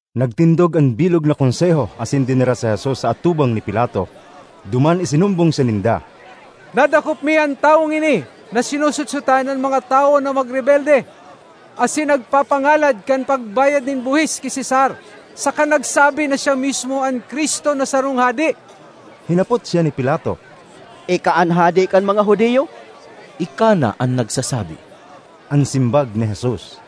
Nagtindog an bilog na Konseho asin dinara si Jesus sa atubang ni Pilato. Duman isinumbong siya ninda, “Nadakop mi an tawong ini na sinosotsotan an mga tawo na magrebelde, asin nagpapangalad kan pagbayad nin buhis ki Cesar saka nagsabi na siya mismo an Cristo na sarong hade.” Hinapot siya ni Pilato, “Ika an hade kan mga Judio?” “Ika na an nagsasabi,” an simbag ni Jesus.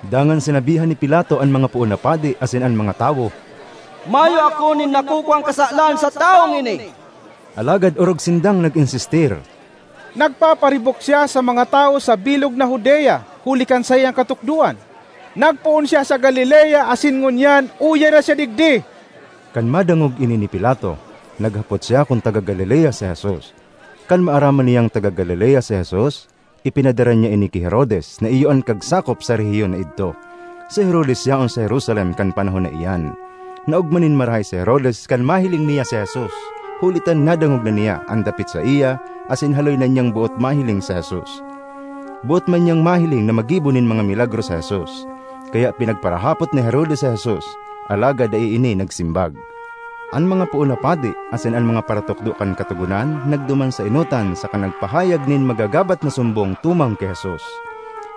Dangan sinabihan ni Pilato an mga poon na padi asin an mga tawo, “Mayo ako nin nakukuang kasalan sa tawong ini.” Alagad orog sindang nag-insistir, “Nagpaparibok siya sa mga tawo sa bilog na Judea huli kan saiyang katukdoan! Nagpoon siya sa Galilea asin ngunyan uya na siya digdi.” Kan madangog ini ni Pilato, naghapot siya kun taga Galilea si Jesus. Kan maaraman niyang taga Galilea si Jesus, ipinadara niya ini ki Herodes na iyo an kagsakop sa rehiyon na idto. Si Herodes yaon sa Jerusalem kan panahon na iyan. Naogma nin marahay si Herodes kan mahiling niya si Jesus, huli ta nadangog na niya an dapit saiya asin haloy na niyang boot mahiling si Jesus. Boot man niyang mahiling na maggibo nin mga milagro si Jesus. Kaya pinagparahapot ni Herodes si Jesus, alagad dai ini nagsimbag. An mga poon na padi asin an mga paratukdo kan Katogonan nagduman sa enotan saka nagpahayag nin magagabat na sumbong tumang ki Jesus.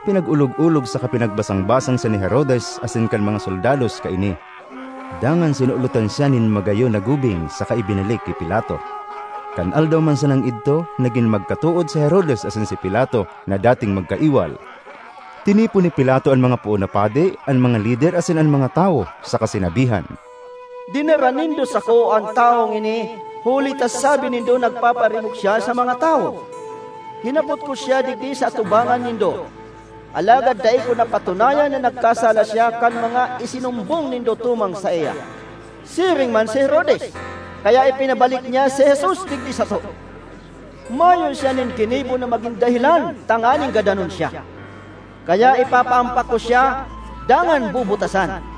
Pinag-olog-olog saka pinagbasang-basang siya ni Herodes asin kan mga soldados kaini; dangan sinulotan siya nin magayon na gubing saka ibinalik ki Pilato. Kan aldaw man sanang idto nagin magkatood si Herodes asin si Pilato na dating magkaiwal. Tinipon ni Pilato an mga poon na padi, an mga lider, asin an mga tawo, saka sinabihan, “Dinara nindo sako an tawong ini huli ta sabi nindo nagpaparibok siya sa mga tawo. Hinapot ko siya digdi sa atubangan nindo, alagad dai ko napatunayan na nagkasala siya kan mga isinumbong nindo tumang saiya; siring man si Herodes, kaya ipinabalik niya si Jesus digdi sato. Mayo siya nin ginibo na magin dahelan tanganing gadanon siya. Kaya ipapahampak ko siya, dangan bubutasan.”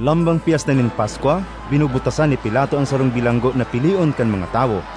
Lambang Pyesta nin Paskwa, binubutasan ni Pilato an sarong bilanggo na pilion kan mga tawo.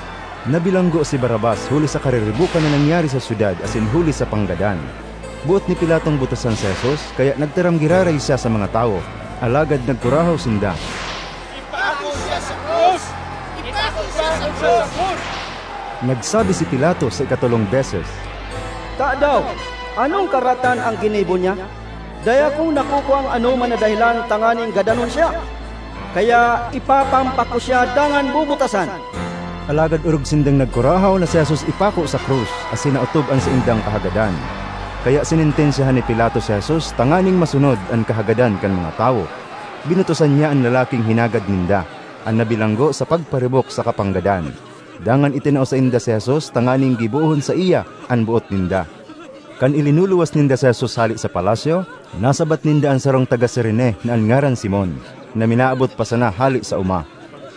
(Nabilanggo si Barrabas huli sa kariribokan na nangyari sa syudad asin huli sa panggadan.) Boot ni Pilatong butasan si Jesus, kaya nagtaram giraray siya sa mga tawo. Alagad nagkurahaw sinda, “Ipako siya sa krus! Ipako siya sa krus!” Nagsabi si Pilato sa ikatolong beses, “Tadaw, anong karatan an ginibo niya? Dai akong nakukuang anoman na dahelan tanganing gadanon siya! Kaya, ipapahampak ko siya dangan bubutasan.” Alagad orog sindang nagkurahaw na si Jesus ipako sa krus, asin naotob an saindang kahagadan. Kaya sinentensyahan ni Pilato si Jesus tanganing masunod an kahagadan kan mga tawo. Binutasan niya an lalaking hinagad ninda, an nabilanggo sa pagparibok saka panggadan. Dangan itinao sainda si Jesus tanganing gibohon saiya an boot ninda. Kan ilinuluwas ninda si Jesus hale sa palasyo, nasabat ninda an sarong taga Cirene na an ngaran Simon, na minaabot pa sana hale sa oma.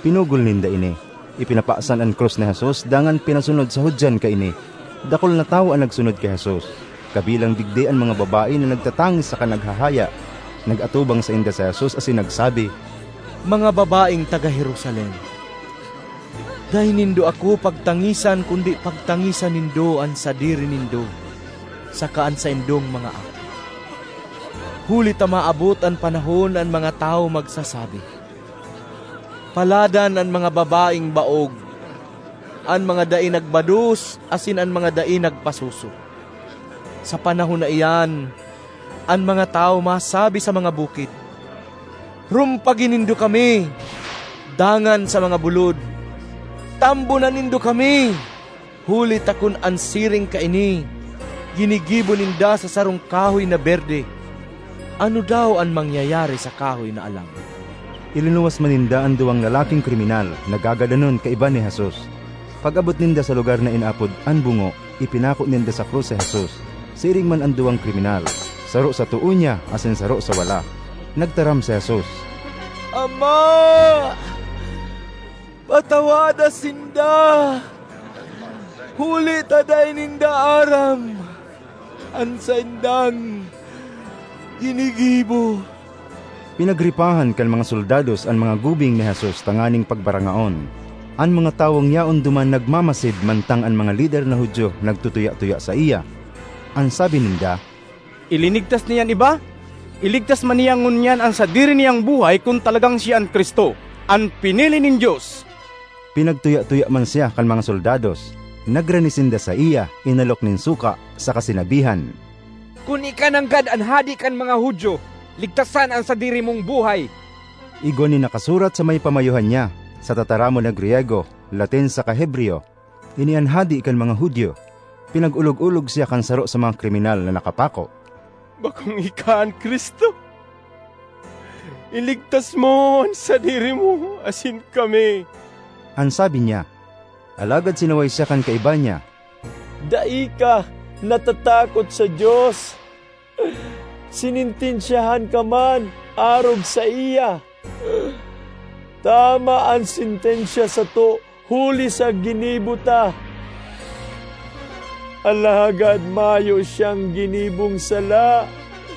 Pinugol ninda ini, ipinapasan an krus ni Jesus dangan pinasunod sa hudyan kaini. Dakul na tawo an nagsunod ki Jesus; kabilang digdi an mga babae na nagtatangis saka naghahaya. Nag-atubang sainda si Jesus asin nagsabi, “Mga babaeng taga Jerusalem, dai nindo ako pagtangisan kundi pagtangisan nindo an sadiri nindo saka an saindong mga aki. Huli ta maabot an panahon na an mga tawo magsasabi, ‘Paladan an mga babaeng baog, an mga dai nagbados asin an mga dai nagpasuso!’ Sa panahon na iyan, an mga tawo masabi sa mga bukid, ‘Rumpagi nindo kami!’ dangan sa mga bulod, ‘Tambonan nindo kami!’ Huli ta kun an siring kaini ginigibo ninda sa sarong kahoy na berde, ano daw an mangyayari sa kahoy na alang?” Ilinuwas man ninda an duwang lalaking kriminal, na gagadanon kaiba ni Jesus. Pag-abot ninda sa lugar na inaapod “An Bungo,” ipinako ninda sa krus si Jesus; siring man an duwang kriminal, saro sa too niya asin saro sa wala. Nagtaram si Jesus, “Ama, patawada sinda! Huli ta dai ninda aram an saindang ginigibo.” Pinagripahan kan mga soldados an mga gubing ni Jesus tanganing pagbarangaon. An mga tawong yaon duman nagmamasid mantang an mga lider na Judio nagtutuya-tuya saiya. An sabi ninda, “Ilinigtas niya an iba; iligtas man niya ngunyan an sadiri niyang buhay kun talagang siya an Cristo, an pinili nin Dios!” Pinagtuya-tuya man siya kan mga soldados; nagrani sinda saiya, inalok nin suka, saka sinabihan, “Kun ika nanggad an hade kan mga Judio, ligtasan an sadiri mong buhay!” Igwa nin nakasurat sa may pamayohan niya (sa tataramon na Griyego, Latin saka Hebreyo), “Ini an Hade kan mga Judio.” Pinag-olog-olog siya kan saro sa mga kriminal na nakapako. “Bakong ika an Cristo? Iligtas mo an sadiri mo asin kami,” an sabi niya. Alagad sinaway siya kan kaiba niya, “Dai ka natatakot sa Dios? Sinentensyahan ka man arog saiya. Tama an sentensya sato huli sa ginibo ta; alagad mayo siyang ginibong sala.”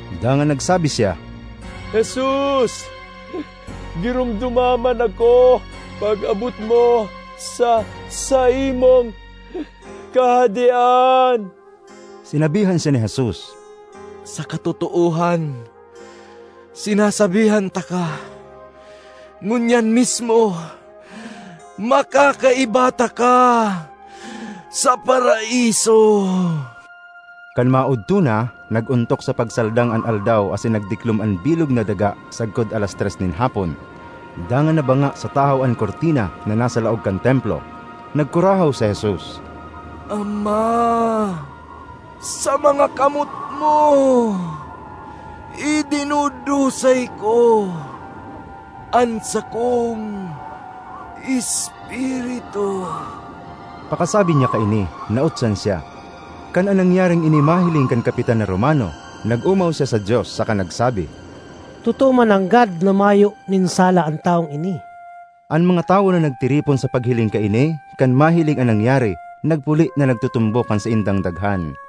Dangan nagsabi siya, “Jesus, giromdoma man ako pag-abot mo sa saimong Kahadean.” Sinabihan siya ni Jesus, “Sa katotoohan sinasabihan taka, ngunyan mismo makakaiba taka sa Paraiso.” Kan maodto na, nag-ontok sa pagsaldang an aldaw asin nagdiklom an bilog na daga sagkod alas tres nin hapon; dangan nabanga sa tahaw an kurtina na nasa laog kan Templo. Nagkurahaw si Jesus, “Ama! Sa mga kamot mo idinudusay ko an sakong espiritu!” Pakasabi niya kaini nautsan siya. Kan an nangyaring ini mahiling kan kapitan na Romano, nag-omaw siya sa Dios saka nagsabi, “Totoo mananggad na mayo nin sala an tawong ini!” An mga tawo na nagtiripon sa paghiling kaini, kan mahiling an nangyari, nagpuli na nagtutumbok kan saindang daghan.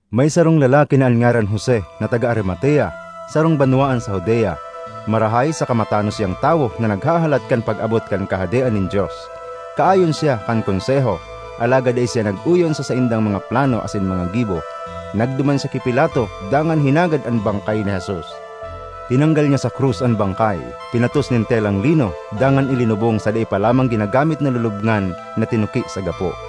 May sarong lalaki na an ngaran Jose, na taga Arimatea, sarong banwaan sa Judea. Marahay saka matanos siyang tawo na naghahalat kan pag-abot kan Kahadean nin Dios. Kaayon siya kan Konseho, alagad dai siya nag-oyon sa saindang mga plano asin mga gibo. Nagduman siya ki Pilato dangan hinagad an bangkay ni Jesus. Tinanggal niya sa krus an bangkay, pinatos nin telang lino, dangan ilinubong sa dai pa lamang ginagamit na lulubngan na tinuki sa gapo.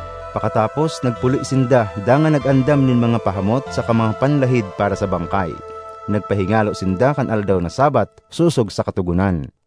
Pakatapos, nagpuli sinda dangan nag-andam nin mga pahamot saka mga panlahid para sa bangkay. Nagpahingalo sinda kan aldaw na Sabbath, sosog sa Katogonan.